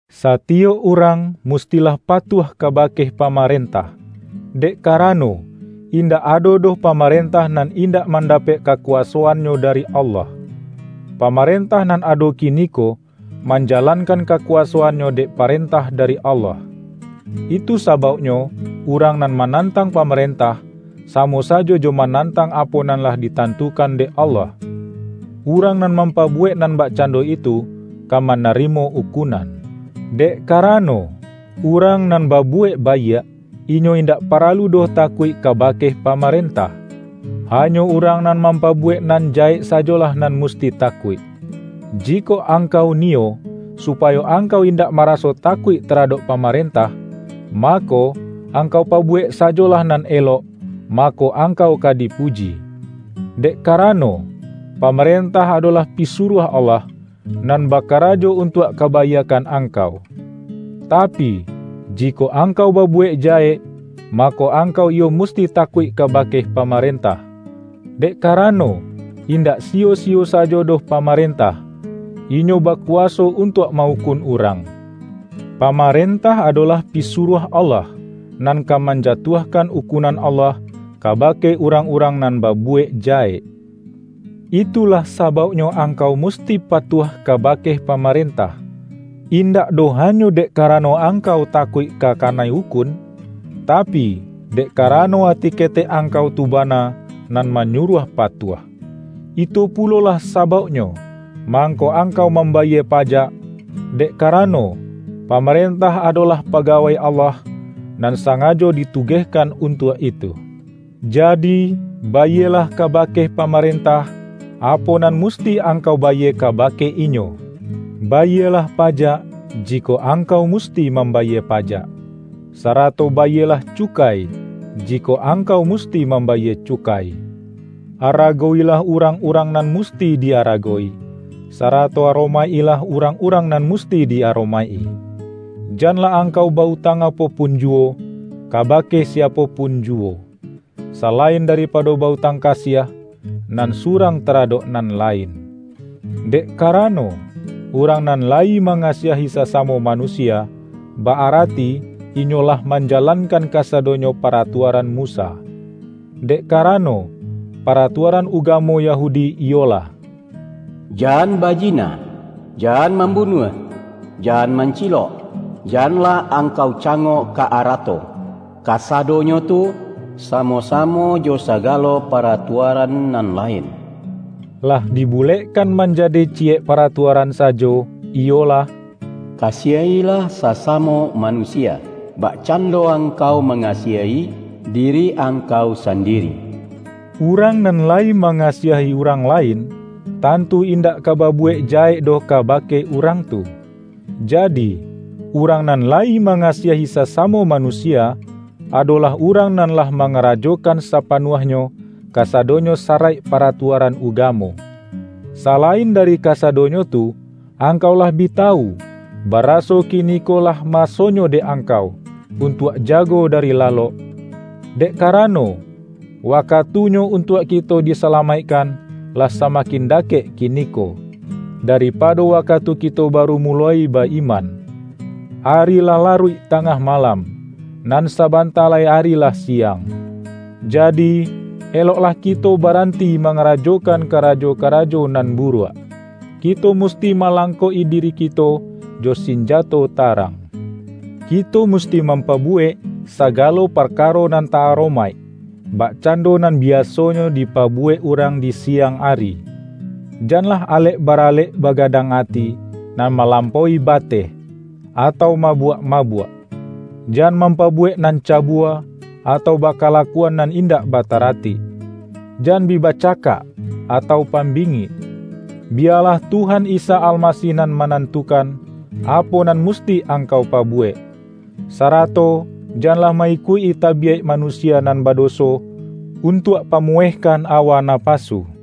Satiyok urang mustilah patuah kabake pamarentah, dek karano, indak ado doh pamarentah nan indak mandapek kakuwasoannyo dari Allah. Pamarentah nan ado kiniko, manjalankan kakuwasoannyo dek parentah dari Allah. Itu sabauknyo urang nan manantang pamarentah, samo sajo jo manantang apo nan lah ditantukan dek Allah. Urang nan mampabuwek nan bakcando itu, ka manarimo ukunan. Dek karano, urang nan babuwek baiak, inyo indak paralu doh takuik kabake pamarentah. Hanyo urang nan mampabuwek nan jahek sajolah nan musti takuik. Jikok angkau niyo, supayo angkau indak maraso takuik taradok pamarentah, mako, angkau pabuwek sajolah nan elok, mako, angkau ka dipuji. Dek karano, pamarentah adolah pisuruah Allah, nan bakarajo untuak kabaiakkan angkau. Tapi, jikok angkau babuwek jahek, mako, angkau iyo musti takuik kabake pamarentah, dek karano, indak siyo-siyo sajo doh pamarentah, inyo bakuwaso untuak ma-ukun urang. Pamarentah adolah pisuruah Allah, nan ka manjatuahkan ukunan Allah kabake urang-urang nan babuwek jahek. Itulah sabauknyo angkau musti patuah kabake pamarentah-indak doh hanyo dek karano angkau takuik ka kanai ukun, tapi, dek karano ati ketek angkau tu bana, nan manyuruah patuah. Itu pulolah sabauknyo, mangko angkau mambayie pajak, dek karano, pamarentah adolah pagawai Allah, nan sangajo ditugehkan untuak itu. Jadi, bayielah kabake pamarentah, apo nan musti angkau bayie kabake inyo. Bayielah pajak, jikok angkau musti mambayie pajak; sarato bayielah cukai, jikok angkau musti mambayie cukai. Aragowilah urang-urang nan musti di-aragowi, sarato aromaik-ilah urang-urang nan musti di-aromaik-i. Janlah angkau ba-utang apo pun juwo, kabake siapo pun juwo, salain daripado ba-utang kasiah, nan surang taradok nan lain. Dek karano, urang nan layi mangasiahi sasamo manusia, ba-arati inyo lah manjalankan kasadonyo paratuaran Musa. Dek karano, paratuaran ugamo Yahudi iyolah: Jan bajina, jan mambunuah, jan mancilok, janlah angkau cangok ka arato; kasadonyo tu, samo-samo jo sagalo paratuaran nan lain, lah dibulekkan manjadi ciyek paratuaran sajo, iyolah,”Kasiah-ilah sasamo manusia, bakcando angkau mangasiahi diri angkau sandiri.” Urang nan layi mangasiahi urang lain, tantu indak ka babuwek jahek doh kabake urang tu. Jadi, urang nan layi mangasiahi sasamo manusia, adolah urang nan lah mangarajokan sapanuahnyo, kasadonyo saraik paratuaran ugamo. Salain dari kasadonyo tu, angkau lah bi tawu, baraso kiniko lah masonyo dek angkau, untuak jago dari lalok. Dek karano, wakatunyo untuak kito disalamaikkan, lah samakin dakek kiniko, daripado wakatu kito baru muloi ba-iman. Ari lah laruik tangah malam; nan sabanta lai ari lah siang. Jadi, eloklah kito baranti mangarajokan karajo-karajo nan buruak. Kito musti malangkok-i diri kito jo sinjato tarang. Kito musti mampabuwek sagalo parkaro nan ta-aromaik, bakcando nan biasonyo dipabuwek urang di siang ari; janlah alek baralek bagadang ati, nan malampaui bateh, atau mabuak-mabuak. Jan mampabuwek nan cabua, atau bakalakuan nan indak bataratik. Jan bi bacakak, atau pambingik. Biyalah Tuhan Isa Almasih nan manantukan, apo nan musti angkau pabuwek. Sarato janlah ma-ikuik-i tabiyaik manusia nan badoso, untuak pamuwehkan awa napasu. R OMA